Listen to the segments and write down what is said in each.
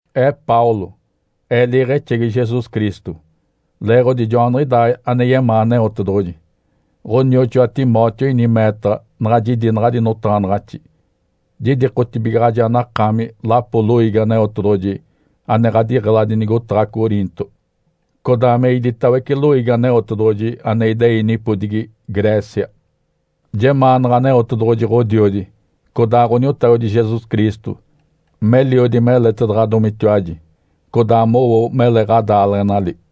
Ee Paulo. Ee liiɡ̶exegi Jesus Cristo, leeɡ̶odi joaniɡ̶idaa ane yemaa Aneotedoɡ̶oji. Ǥonioxoa Timóteo ini meetaɡ̶a naɡ̶a jidi naɡ̶adi notaɡ̶anaɡ̶axi. Jidikotibigaɡ̶aji anakaami lapo loiigi Aneotedoɡ̶oji ane ɡ̶adiɡ̶eladi nigotaɡ̶a Coriinto, codaa me iditawece loiigi Aneotedoɡ̶oji ane idei nipodigi Grécia. Jemaanaɡ̶a Aneotedoɡ̶oji Ǥodiodi codaa Ǥoniotagodi Jesus Cristo meliodi meletaɡ̶adomitiwaji, codaa mowo mele ɡ̶adaaleɡ̶enali.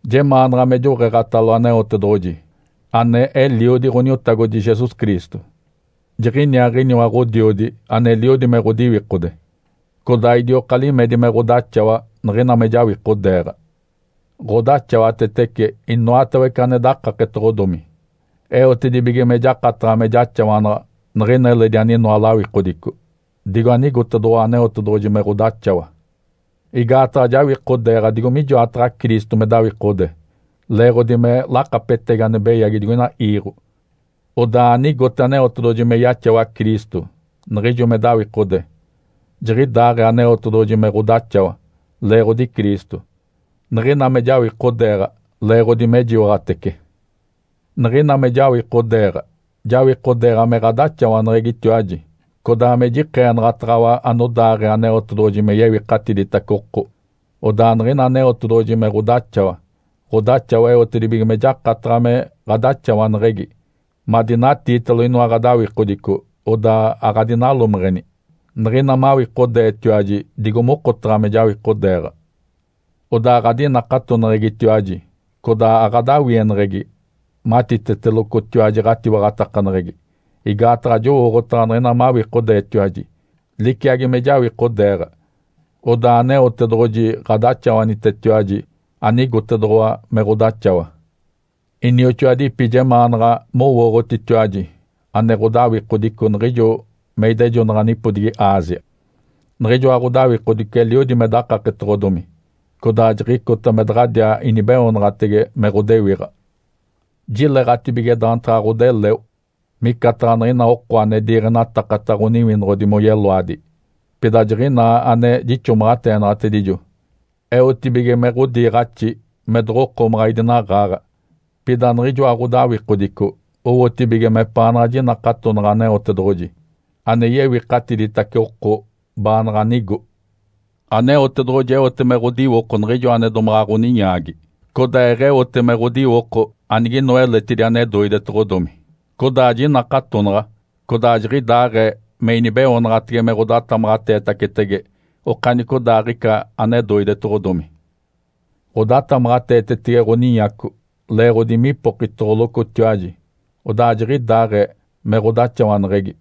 Jemaanaɡ̶a me joɡ̶eeɡ̶atalo Aneotedoɡ̶oji, ane Eliodi Ǥoniotagodi Jesus Cristo. Jiɡ̶iniaaɡ̶iniwa Ǥodiodi aneliodi me ɡ̶odiwikode, codaa idioka limedi me ɡ̶odaxawa niɡ̶ina me jawikodeeɡ̶a. Ǥodaxawatetece inoatawece ane dakaketoɡ̶odomi, eotedibige me jakataɡ̶a me jaxawanaɡ̶a niɡ̶ina eledi aninoa lawikodico, digo anigotedoɡ̶owa Aneotedoɡ̶oji me ɡ̶odaxawa. Igaataɡ̶a jawikodeeɡ̶a digo mijoataɡ̶a Cristo me dawikode leeɡ̶odi me lakapetegi ane beyagi digoina iiɡ̶o. Odaa anigote Aneotedoɡ̶oji me yaxawa Cristo niɡ̶ijo me dawikode, jiɡ̶idaaɡ̶ee Aneotedoɡ̶oji me ɡ̶odaxawa leeɡ̶odi Cristo, niɡ̶ina me jawikodeeɡ̶a leeɡ̶odi mejiwaɡ̶atece. Niɡ̶ina me jawikodeeɡ̶a, jawikodeeɡ̶a me ɡ̶adaxawaneɡ̶egitiwaji, codaa me jikeenaɡ̶ataɡ̶awa anodaaɡ̶ee Aneotedoɡ̶oji me yewikatiditace oko. Odaa niɡ̶ina Aneotedoɡ̶oji me ɡ̶odaxawa, ɡ̶odaxawa eotedibige me jakataɡ̶a me ɡ̶adaxawaneɡ̶egi madinatiitalo inoa ɡ̶adawikodico odaa aɡ̶adinalomeɡ̶eni, niɡ̶ina mawikodeetiwaji digo mokotaɡ̶a me jawikodeeɡ̶a. Odaa ɡ̶adinakatoneɡ̶egitiwaji, codaa aɡ̶adawieneɡ̶egi matitetelocotiwaji ɡ̶atiwaɡ̶atakaneɡ̶egi. Igaataɡ̶a jowooɡ̶otaɡ̶a niɡ̶ina mawikodeetiwaji liciagi me jawikodeeɡ̶a, odaa Aneotedoɡ̶oji ɡ̶adaxawanitetiwaji anigotedoɡ̶owa me ɡ̶odaxawa. Inioxoadipi, jemaanaɡ̶a mowooɡ̶otitiwaji ane ɡ̶odawikodico niɡ̶ijo me idejonaɡ̶a nipodigi Ásia. Niɡ̶ijoa ɡ̶odawikodico eliodi me dakaketoɡ̶odomi, codaa jiɡ̶icota me daɡ̶adiaa inibeoonaɡ̶atege me ɡ̶odewiɡ̶a. Jileɡ̶atibige daantaɡ̶a ɡ̶odeleo, micataɡ̶a niɡ̶ina oko ane diiɡ̶enatakata ɡ̶oniwinoɡ̶odi moyeloadi. Pida jiɡ̶inaa ane jixomaɡ̶ateenaɡ̶atedijo eotibige me ɡ̶odiiɡ̶axi me doɡ̶okomaɡ̶a idinaɡ̶aaɡ̶a, pida niɡ̶ijoa ɡ̶odawikodico owotibige mepaanaɡ̶a jinakatonaɡ̶a Aneotedoɡ̶oji ane yewikatiditace oko baanaɡ̶a nigo. Aneotedoɡ̶oji eote me ɡ̶odiwoko niɡ̶ijo ane domaɡ̶a ɡ̶oninyaagi, codaa eɡ̶eote me ɡ̶odiwoko aniginoa eletidi ane doidetedoɡ̶odomi. Codaa jinakatonaɡ̶a, codaa jiɡ̶idaaɡ̶ee me inibeoonaɡ̶atege me ɡ̶odatamaɡ̶ateetacetege okanicodaaɡ̶ica ane doidetoɡ̶odomi. Ǥodatamaɡ̶ateetetege ɡ̶oninyaco leeɡ̶odi mipokitoɡ̶olocotiwaji, odaa jiɡ̶idaaɡ̶ee me ɡ̶odaxawaneɡ̶egi.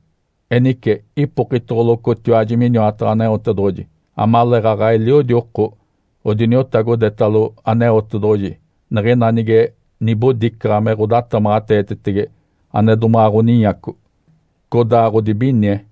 Enice ipokitoɡ̶olocotiwaji miniwataɡ̶a Aneotedoɡ̶oji amaleeɡ̶aɡ̶a eliodi oko odiniotagodetalo Aneotedoɡ̶oji niɡ̶ina nige nibodicaɡ̶a me ɡ̶odatamaɡ̶ateetetege ane domaɡ̶a ɡ̶oninyaco, codaa ɡ̶odibinie.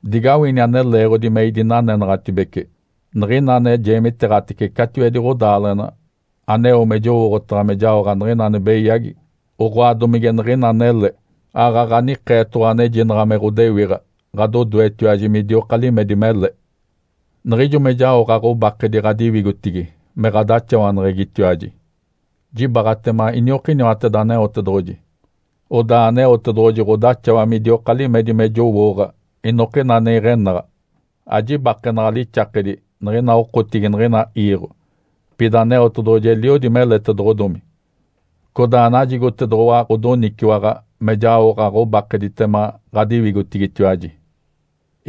Digawini ane leeɡ̶odi me idinanenaɡ̶atibece. Niɡ̶ina ane jeemiteeɡ̶atece catiwedi ɡ̶odaaleɡ̶ena aneo me jowooɡ̶otaɡ̶a me jaoɡ̶a niɡ̶ina ane beyagi, oɡ̶oa domige niɡ̶ina anele, aaɡ̶aɡ̶a nikeetoɡ̶owa anejinaɡ̶a me ɡ̶odewiɡ̶a ɡ̶adodoetiwaji midioka limedi mele. Niɡ̶ijo me jaoɡ̶a ɡ̶obakedi ɡ̶adiwigotigi me ɡ̶adaxawaneɡ̶egitiwaji, jibaaɡ̶atema iniokiniwateda Aneotedoɡ̶oji, odaa Aneotedoɡ̶oji ɡ̶odaxawa midioka limedi me jowooɡ̶a inokina ane iɡ̶enaɡ̶a. Ajibakenaɡ̶a lixakedi niɡ̶ina okotigi niɡ̶ina iiɡ̶o. Pida Aneotedoɡ̶oji eliodi meletedoɡ̶odomi, codaa najigotedoɡ̶owa ɡ̶odoniciwaɡ̶a me jaoɡ̶a ɡ̶obakeditema ɡ̶adiwigotigitiwaji.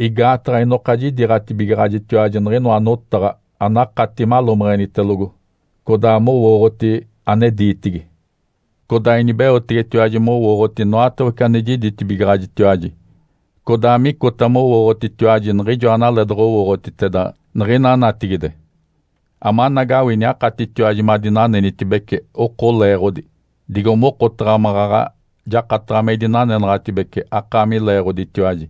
Igaataɡ̶a inoka jidiiɡ̶atibigaɡ̶ajitiwaji niɡ̶inoa notaɡ̶a anakati malomeɡ̶enitelogo codaa mowooɡ̶oti ane diitigi. Codaa inibeotegetiwaji mowooɡ̶oti inoatawece ane jiditibigaɡ̶ajitiwaji, codaa micota mowooɡ̶otitiwaji niɡ̶ijoa analee doɡ̶owooɡ̶otiteda niɡ̶ina natigide, amanagawini akatitiwaji madinanenitibece oko leeɡ̶odi, digo mokotaɡ̶a maɡ̶aɡ̶a jakataɡ̶a me idinanenaɡ̶atibece akaami leeɡ̶oditiwaji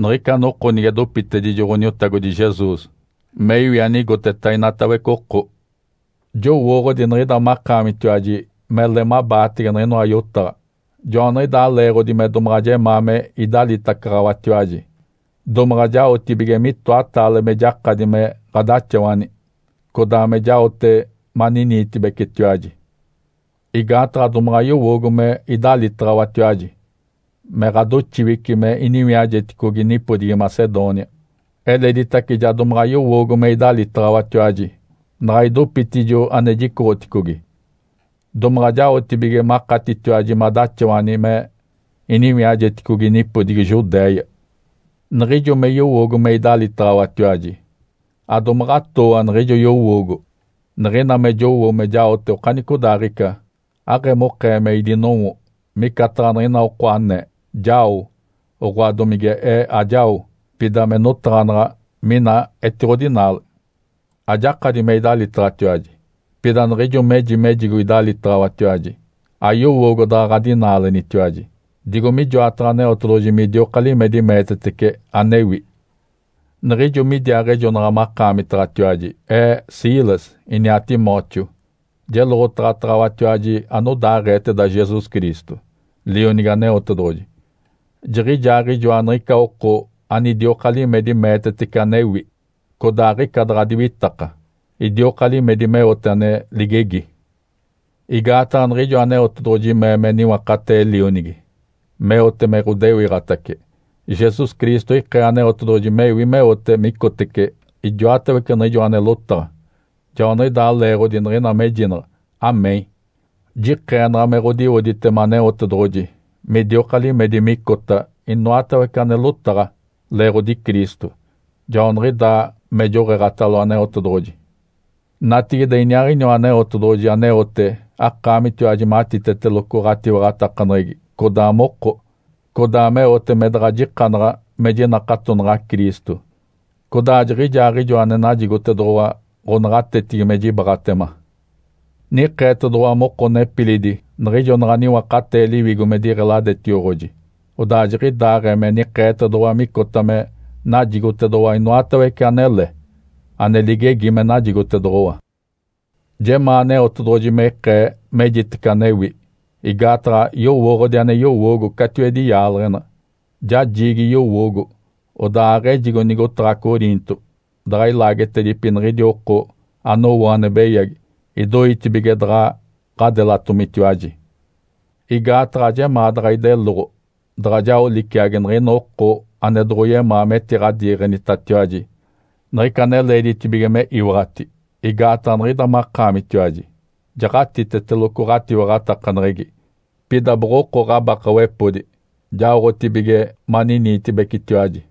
niɡ̶ica noko nige dopitedijo Ǥoniotagodi Jesus me iwi anigoteta inatawece oko. Jowooɡ̶odi niɡ̶ida makaamitiwaji mele mabaatege niɡ̶inoa yotaɡ̶a, joaniɡ̶idaa leeɡ̶odi me domaɡ̶a jemaa me idalitacaɡ̶awatiwaji, domaɡ̶a jaotibige mitoataale me jakadi me ɡ̶adaxawani, codaa me jaote maniniitibecetiwaji. Igaataɡ̶a domaɡ̶a yowoogo me idalitaɡ̶awatiwaji me ɡ̶adoxiwici me iniwiajeticogi nipodigi Macedônia. Eleditace ja domaɡ̶a yowoogo me idalitaɡ̶awatiwaji naɡ̶a idopitijo ane jicoɡ̶oticogi, domaɡ̶a jaotibige makatitiwaji madaxawani me iniwiajeticogi nipodigi Judéia. Niɡ̶ijo me yowoogo me idalitaɡ̶awatiwaji, adomaɡ̶atooa niɡ̶ijo yowoogo. Niɡ̶ina me jowo me jaote okanicodaaɡ̶ica, aɡ̶emokee me idinowo, micataɡ̶a niɡ̶ina oko anee, “Jao”, oɡ̶oa domige ee, “Ajao”, pida me notaɡ̶anaɡ̶a mina etiɡ̶odinaale. Ajakadi me idalitaɡ̶awatiwaji. Pida niɡ̶ijo meji mejigo idalitaɡ̶awatiwaji, ayowoogo daɡ̶a ɡ̶adinaalenitiwaji, digo mijoataɡ̶a Aneotedoɡ̶oji midioka limedi meetetece anewi. Niɡ̶ijo midiaaɡ̶ejonaɡ̶a makaamitaɡ̶atiwaji ee, Silas, iniaa Timóteo, jeloɡ̶otaɡ̶ataɡ̶awatiwaji anodaaɡ̶eeteda Jesus Cristo, Lionigi Aneotedoɡ̶oji. Jiɡ̶ijaaɡ̶ijoa niɡ̶ica oko anidioka limedi meetetece anewi, codaa aɡ̶ica daɡ̶a diwitaka. Idioka limedi meote ane ligegi. Igaataɡ̶a niɡ̶ijo Aneotedoɡ̶oji mee me niwakatee Lionigi meote me ɡ̶odewiɡ̶atace, Jesus Cristo ikee Aneotedoɡ̶oji mewi meote me icotece ijoatawece niɡ̶ijoa ane lotaɡ̶a. Joaniɡ̶idaa leeɡ̶odi niɡ̶ina mejinaɡ̶a, “Amém”, jikeenaɡ̶a me ɡ̶odiwoditema Aneotedoɡ̶oji midioka limedi micota inoatawece ane lotaɡ̶a, leeɡ̶odi Cristo. Joaniɡ̶idaa me joɡ̶eeɡ̶atalo Aneotedoɡ̶oji. Natigide, iniaaɡ̶iniwa Aneotedoɡ̶oji aneote akaamitiwaji matiteteloco ɡ̶atiwaɡ̶atakaneɡ̶egi codaa moko, codaa meote me daɡ̶ajikanaɡ̶a me jinakatonaɡ̶a Cristo. Codaa jiɡ̶ijaaɡ̶ijoa ane najigotedoɡ̶owa ɡ̶onaɡ̶atetigi me jibaaɡ̶atema. Nikeetedoɡ̶owa moko nepilidi, niɡ̶ijo naɡ̶a niwakatee Liwigo me diɡ̶eladetioɡ̶oji, odaa jiɡ̶idaaɡ̶ee me nikeetedoɡ̶owa micota me najigotedoɡ̶owa inoatawece anele, ane ligegi me najigotedoɡ̶owa. Jemaa Aneotedoɡ̶oji me ikee mejitece anewi, igaataɡ̶a yowooɡ̶odi ane yowoogo catiwedi yaaleɡ̶ena. Ja jiigi yowoogo, odaa aɡ̶ejigo nigotaɡ̶a Coriinto daɡ̶a ilaagetedipi niɡ̶idi oko anowo ane beyagi idoitibige daɡ̶a ɡ̶adelatomitiwaji. Igaataɡ̶a ajemaa daɡ̶a ideloɡ̶o daɡ̶a jao liciagi niɡ̶ina oko ane domoɡ̶oyemaa metiɡ̶adiiɡ̶enitatiwaji niɡ̶ica ane leeditibige me iwaɡ̶ati, igaataɡ̶a niɡ̶ida makaamitiwaji jaɡ̶atiteteloco ɡ̶atiwaɡ̶atakaneɡ̶egi. Pida boɡ̶oko ɡ̶abakawepodi, jaoɡ̶atibige maniniitibecetiwaji.